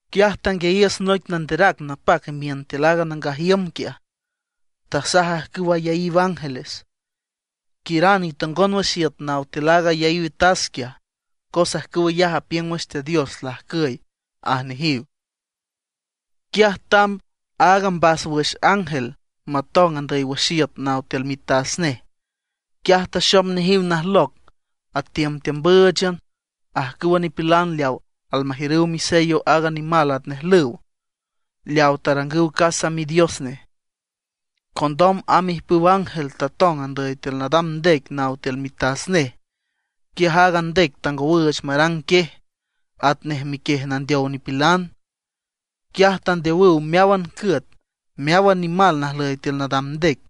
Quiaj tanguiayiüs noic nanderac napac imiün tiül aaga nangaj iüm quiaj, tasaj ajcüw ayaíw ángeles: ―Quiüran itongon wüx iüt naw tiül aaga ayaíw tas quiaj, cos ajcüw ayaj apiüng wüx Teat Dios lajcüy ―aj nejiw. Quiaj tamb aaga mbáswüx ángel matong andüy wüx iüt naw tiül mitas nej. Quiaj taxom nejiw najloc atiümtiümbǘüchan ajcüwa nipilan leawa almajiürüw misello aaga nimal atnej lüw, leawa tarangüw casa midios nej. Condom amb ijpüw ángel tatong andüy tiül nadam ndec naw tiül mitas nej. Quiaj aaga ndec tangowüüch marang quiej atnej miquiej nandeow nipilan. Quiaj tandeowüw meáwan cüet, meáwan nimal najlüy tiül nadam ndec.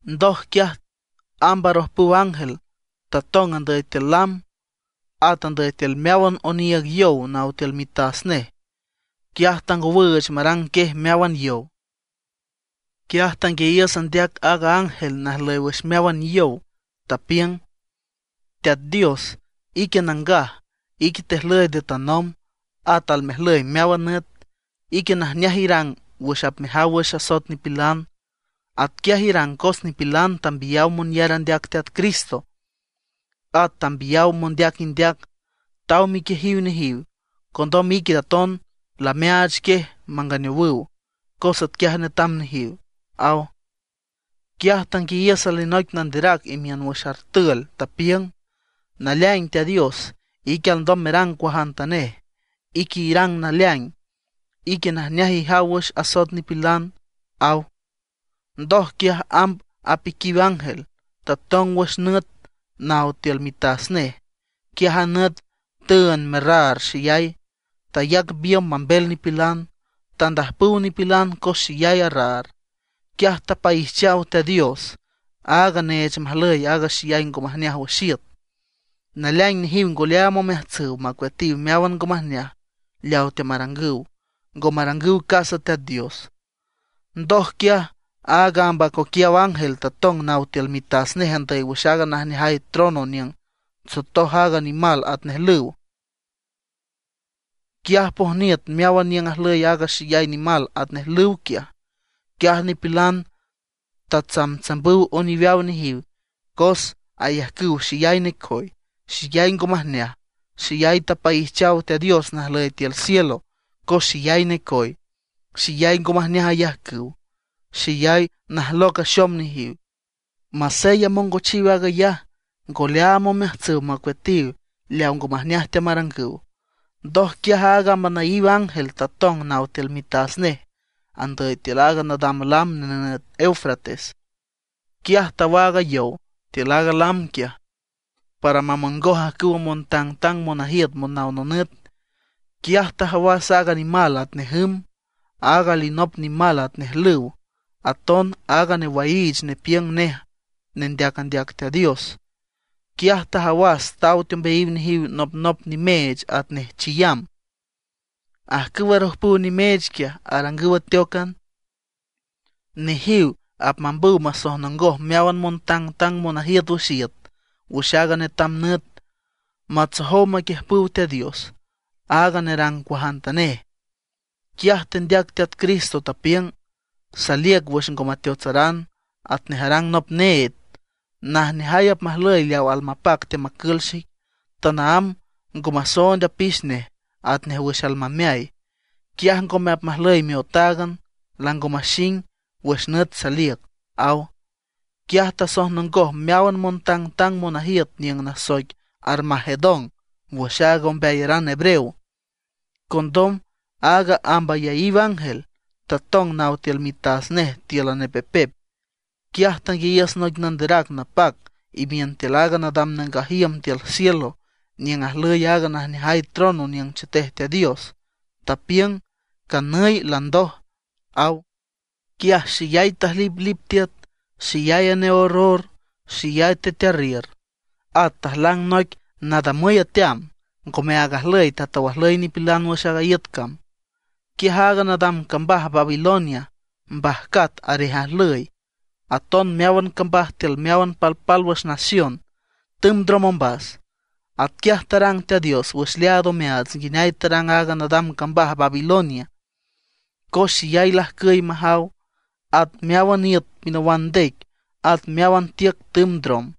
Ndoj quiaj amb arojpüw ángel tatong andüy tiül lam, at andüy tiül meáwan oniiüg yow naw tiül mitas nej. Quiaj tangowüüch marang quiej meáwan yow. Quiaj tanguiayiüs andeac aaga ángel najlüy wüx meáwan yow, tapiüng: ―Teat Dios, ique nangaj, ique tejlüy nde tanomb, at almejlüy meáwan nüt. Ique najneaj irang wüx apmejaw wüx asoet nipilan. Atquiaj irang cos nipilan tambiyaw monyar andeac Teat Cristo, at tambiyaw mondeac indeac, taw miquiejiw nejiw. Condom ique aton lameaach quiej manganeowüw, cos atquiaj netam nejiw ―aw. Quiaj tanguiayiüs alinoic nanderac imiün wüx artül, tapiüng: ―Naleaing Teat Dios, ique alndom merang cuajantanej. Ique irang naleaing, ique najneaj ijaw wüx asoet nipilan ―aw. Ndoj quiaj amb apiquiw ángel, tatong wüx nüt naw tiül mitas nej. Quiaj a nüt tüünd merraar xeyay, tayac biümb mambel nipilan. Tandajpüw nipilan cos xeyay arraar. Quiaj tapaijchaw Teat Dios, aag neech majlüy aaga xeyay ngo majneaj wüx iüt. Naleaing nejiw ngo leaam omeajtsüw macueatiw meáwan ngo majneaj leaw teamarangüw; ngo marangüw casa Teat Dios. Ndoj quiaj aaga amb acoquiaw ángel tatong naw tiül mitas nej andüy wüx aaga najneajay trono niüng tsotoj aaga nimal atnej lüw. Quiaj pojniüt meáwan niüng ajlüy wüx aaga nimal atnej lüw quiaj. Quiaj nipilan atsamtsambüw oniweaw nejiw cos ayajcüw xeyay necoy, xeyay ngo majneaj. Xeyay tapaijchaw Teat Dios najlüy tiül cielo cos xeyay necoy, xeyay ngo majneaj ayajcüw, xeyay najloc axom nejiw. Masey amongochiw aag ayaj, ngo leaam omeajtsüw macueatiw leawa ngo majneaj teamarangüw. Ndoj quiaj aaga amb anaíw ángel tatong naw tiül mitas nej andüy tiül aaga nadam lam nenüt Eufrates. Quiaj tawaag a yow tiül aaga lam quiaj, para mamongoj ajcüwa montangtang monajiüt monaw nonüt. Quiaj tajawas aaga nimal atnej jüm, aaga alinop nimal atnej lüw, aton aaga newaiich nepiüng nej nendeac andeac Teat Dios. Quiaj tajawas taw teombeayiw nejiw nopnop nimeech atnej chiyam. Ajcüw arojpüw nimeech quiaj, arangüw ateócan. Nejiw apmambüw masojnongoj meáwan montangtang monajiüt wüx iüt wüx aaga netam nüt, matsojow maquiüjpüw Teat Dios, aaga nerang cuajantanej. Quiaj tendeac Teat Cristo, tapiüng: “Saliüc wüx ngo mateotsaran, atnej arang nop need. Najneajay apmajlüy leaw almapac teamacül xic, tanaámb ngo masoond apix nej atnej wüx almameay; quiaj ngome apmajlüy miotáagan, lango maxing wüx nüt saliüc”, aw. Quiaj tasojnongoj meáwan montangtang monajiüt niüng nasoic Armagedón wüx aaga ombeayaran hebreo. Condom aaga amb ayaíw ángel tatong naw tiül mitas nej tíülan nepepep. Quiaj tanguiayiüs noic nanderac napac imiün tiül aaga nadam nangaj iüm tiül cielo niüng ajlüy aaga najneajay trono niüng chetej Teat Dios, tapiüng: ―¡Canüy landoj! ―aw. Quiaj xeyay tajliplip tiüt, xeyay aneorror, xeyay tetearriür. At tajlang noic nadamüy ateam, ngomeaag ajlüy tatow ajlüy nipilan wüx a iüt cam. Quiaj aaga nadam cambaj Babilonia mbajcat arej ajlüy. Aton meáwan cambaj tiül meáwan palpálwüx nación tümb ndrom ombas. Atquiaj tarang Teat Dios wüx leaad omeaats nguineay tarang aaga nadam cambaj Babilonia, cos xeyay lajcüy majaw. At meáwan iüt pinawan ndec, at meáwan tiüc tümb ndrom.